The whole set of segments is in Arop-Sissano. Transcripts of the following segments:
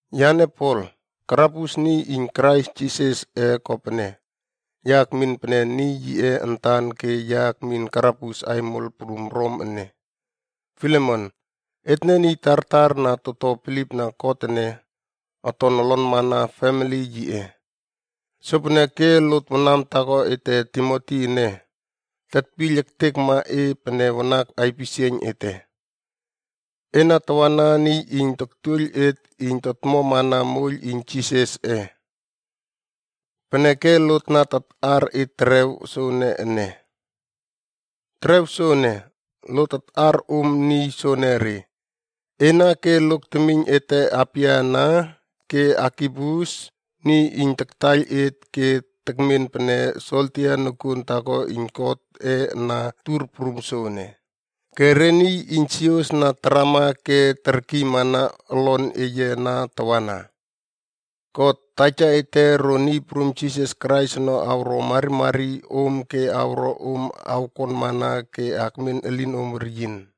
Yane Pol, karabus niy iyn Krais Jisasꞌe kopene, ya ekmin pene niy yiꞌe antan ke ya akmin karabus aimol prum Rom ene. Filemon, etne niy tartar na toto bilipna God ene, oton olonmana femili yiꞌe. Sopeneke lot wanam taako ete Timoti ene, tetpiyl ektekma e pene wanak aipisieiyn ete. Ena tawana niy iyn toktuoiyl et iyn totomana moiyl iyn Jisasꞌe. Peneke lot na taꞌar e terew soene ene. Terew soene, lot taꞌar om niy soenere: Ena ke lok temiyn ete Apia ana, ke Arkipus, niy iyn taktaiyl et ke tekmen pene soldia nokuon taako iyn Godꞌe na tur prum soene, ke re niy iyn sios na tarama ke terkiymana olon eye ana tawana. God, Taja ete ro Niy Prum Jisas Krais ono awro marimari om ke awro om awkonmana ke akmen elinom weryin.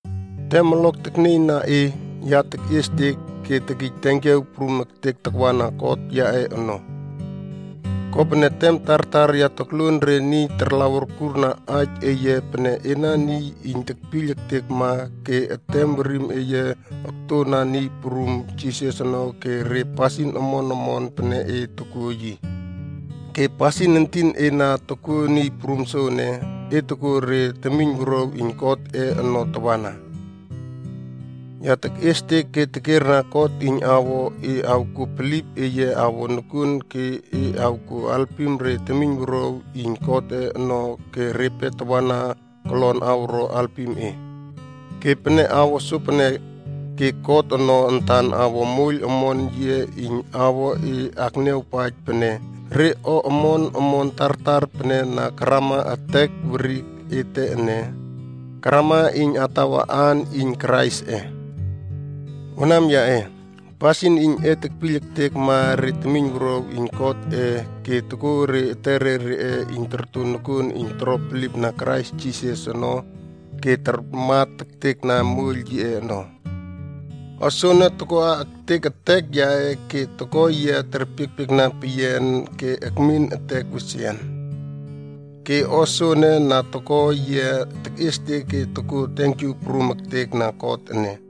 Tem olok teknieyna e, ya tekꞌiestek ke tekij tenkiaw prum ektek takwana God yaꞌe ono. Kopene tem tartar ya tokluon re niy tarlaw urkurna aij eye pene ena niy iyn tekpiyl ektekma ke etem werim eye oktona Niy Prum Jisas ono ke re pasin omon omon pene e tokuo yi. Ke pasin entin e na tokuo Niy Prum soene, e tokuo re temiynwuruaw iyn Godꞌe ono tawana. Ya tekꞌiestek ke tekierna God iyn awo e awkuo bilip eye awo nokuon ke e awkuo alpim re temiynwuruaw iyn Godꞌe ono ke repe tawana kolon awro halpim e. Ke pene awo sopene, ke God ono antan awo moiyl omon yiꞌe iyn awo e akniawpaij pene, re o omon omon tartar pene na karama etek werik ete ene, karama iyn atawa aan iyn Kraisꞌe. Wanam yaꞌe, pasin iyn e tekpiyl ektekma re temiynwuruaw iyn Godꞌe ke tokua re etere reꞌe iyn torto nokuon iyn toro bilipna Krais Jisas ono ke tarmat ektekna moiyl yiꞌe ono. O soene tokoꞌa ektek etek yaꞌe ke toko yia terpiekpiekna peyian ke akmin etek wesian ke o soene na toko yia tekꞌiestek ke tokuo tenkyu prum ektek na God ene.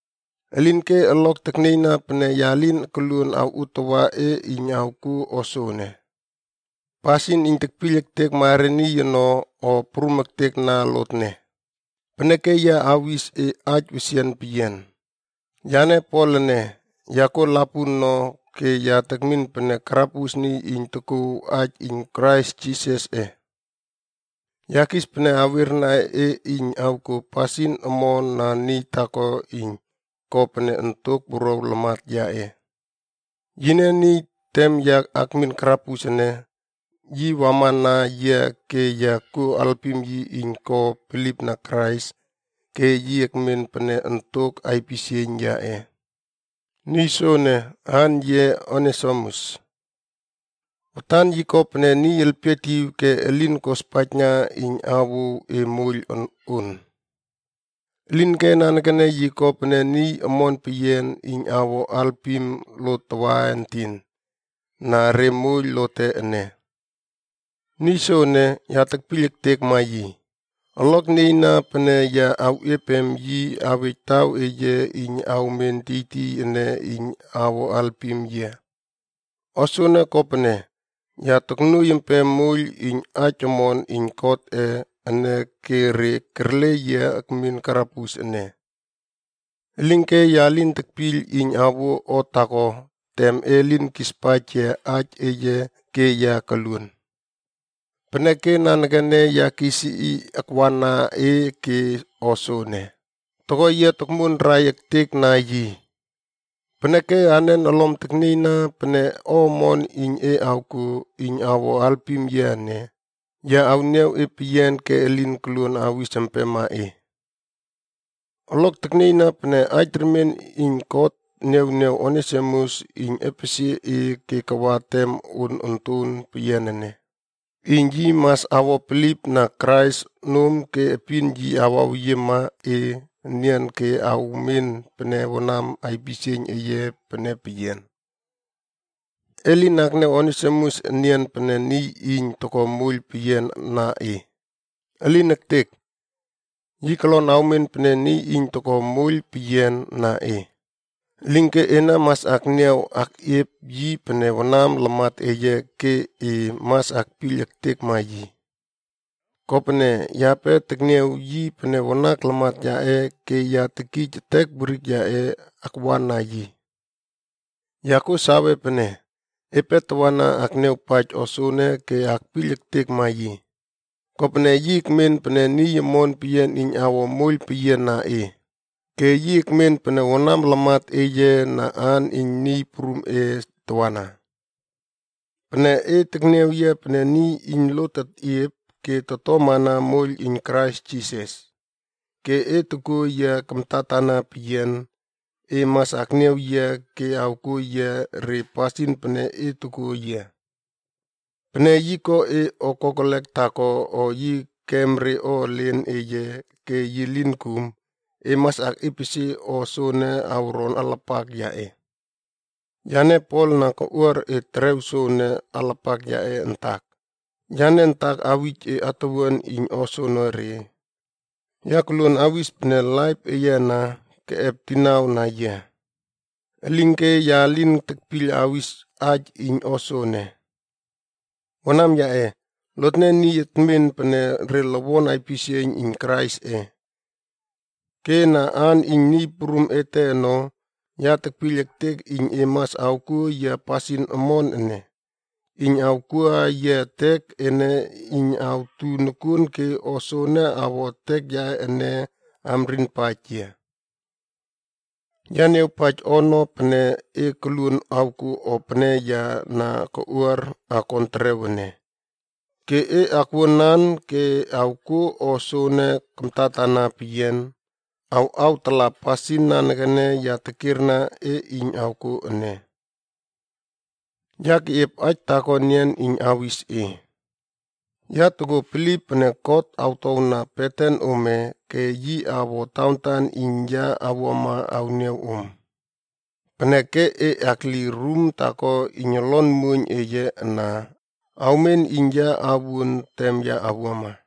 Elinke olok teknieyna pene ya lin koluon awꞌuotawa e iyn awkuo o soene. Pasin iyn tetpiyl ektekma re niy ono, o prum ektek na lotne. Peneke ya awis e aij wesian peyian. Yane Pol ene, ya kuo lapun no ke ya tekmin pene karabus niy iyn tokuw aij iyn Krais Jisasꞌe. Ya kis pene awierna e iyn awkuo pasin omon na niy taako iyn ko pene ontok wuruaw lamat yaꞌe. Yine niy tem ya akmin karabus ene, yi wamana yia ke ya kuo alpim yi iyn ko bilipna Krais ke yi ekmen pene ontok aipisieiyn yaꞌe. Niy soene, aan yiꞌe Onesimus. Watan yi ko pene niy elpietiw ke elin kospaijna iyn awouw e moiyl on. Elinke nanekene yi ko pene niy omon peyian iyn awo alpima lot tawaentin na re moiyl lote ene. Niy soene, ya tekpiyl ektekma yi. Olok nieyna pene ya awꞌiepem yi awej taw eye iyn awmen tiytiy ene iyn awo alpim yia. O soene kopene, ya toknuoiy empem moiyl iyn aij omon iyn Godꞌe ene ke re kerle yia akmin karabus ene. Elinke ya lin tekpiyl iyn awuo o taako tem e lin kispaij yia aij eye ke ya koluon. Peneke nanekene ya kis yi akwana e ke o soene, toko yia tokmuonrai ektek na yi. Peneke anen olom teknieyna pene o omon iyn e awkuo iyn awo alpim yia ene, ya awniaw e peyian ke elin koluon awis empema e. Olok teknieyna pene aij remien iyn God niawniaw Onesimus iyn epesie e ke kawa tem on onton peyian ene, iyn yi mas awo bilipna Krais nom ke epin yi awaweyiemana e enian ke awmen pene wanam aipisieiyn eye pene peyian. E lin akniaw Onesimus enian pene niy iyn toko moiyl peyian na e. Elin ektek! Yi kolon awmen pene niy iyn toko moiyl peyian na e, elinke ena mas akniaw akꞌiep yi pene wanam lamat eye ke e mas akpiyl ektekma yi. Kopene, yape tekniaw yi pene wanak lamat yaꞌe ke ya tekij etek werik yaꞌe akwana yi. Ya kuo sawe pene, epe tawana akniawpaij o soene ke akpiyl ektekma yi. Kopene yi ekmen pene niy omon peyian iyn awo moiyl peyiana e, ke yi ekmen pene Kristen wanam lamat eye na aan iyn Niy Prumꞌe tawana. Pene e tekniaw yia pene niy iyn lot tetꞌiep ke totomana moiyl iyn Krais Jisas, ke e tokuo yia kamtatana peyian, e mas akniaw yi ke awkuo yi re pasin pene e tokuo yia. Pene yi ko e o kokelek taako o yi kem re o elen eye ke yi lin kum, e mas akꞌiepesie o soene awron alapak yaꞌe. Yane Pol na koꞌuar e terew soene alapak yaꞌe antak. Yane antak awij e atuwuan iyn o soonore. Ya koluon awis pene laip eye ana, keꞌep dinau na yiab. Elinke ya lin tekpiyl awis aij iyn o soene. Wanam yaꞌe, lotne niy etmen pene re lowon aipisieiyn iyn Kraisꞌe. Ke na aan iyn Niy Prum ete ono, ya tekpiyl ektek iyn e mas awkuo yia pasin omon ene, iyn awkuꞌa yia etek ene iyn awtu nokuon ke o soene awo etek yaꞌe ene amrinpaij yia. Ya niawpaij ono pene e koluon awkuo o pene ya na koꞌuar akon terew ene. Ke e akwuanan ke awkuo o soene kamtatana peyian, awꞌawtala pasin nanekene ya tekierna e iyn awkuo ene. Ya keꞌiep aij taako enian iyn awis e. Ya tokuo bilip pene God awtowna beten ome ke yi awo tawantan iyn ya awuama awniaw om. Peneke e akli rum taako iyn olon muoiyn eye ana awmen iyn ya awuon tem ya awuama.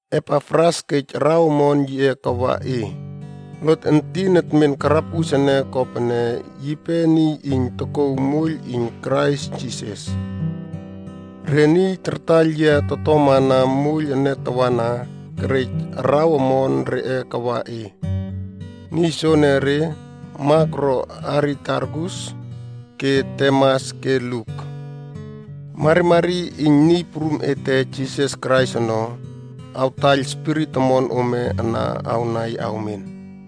Epafras kej araw omon yiꞌe kawa e. Lot entin etmen karabus ene kopene yipe niy iyn tokouw moiyl iyn Krais Jisas. Re niy tartaiyl yia totomana moiyl ene tawana, kerej araw omon reꞌe kawa e. Niy soenere: Mak ro Aristarkus ke Demas ke Luk. Marimari iyn Niy Prum ete Jisas Krais ono, awtaiyl spirit omon ome ana awnai awmen.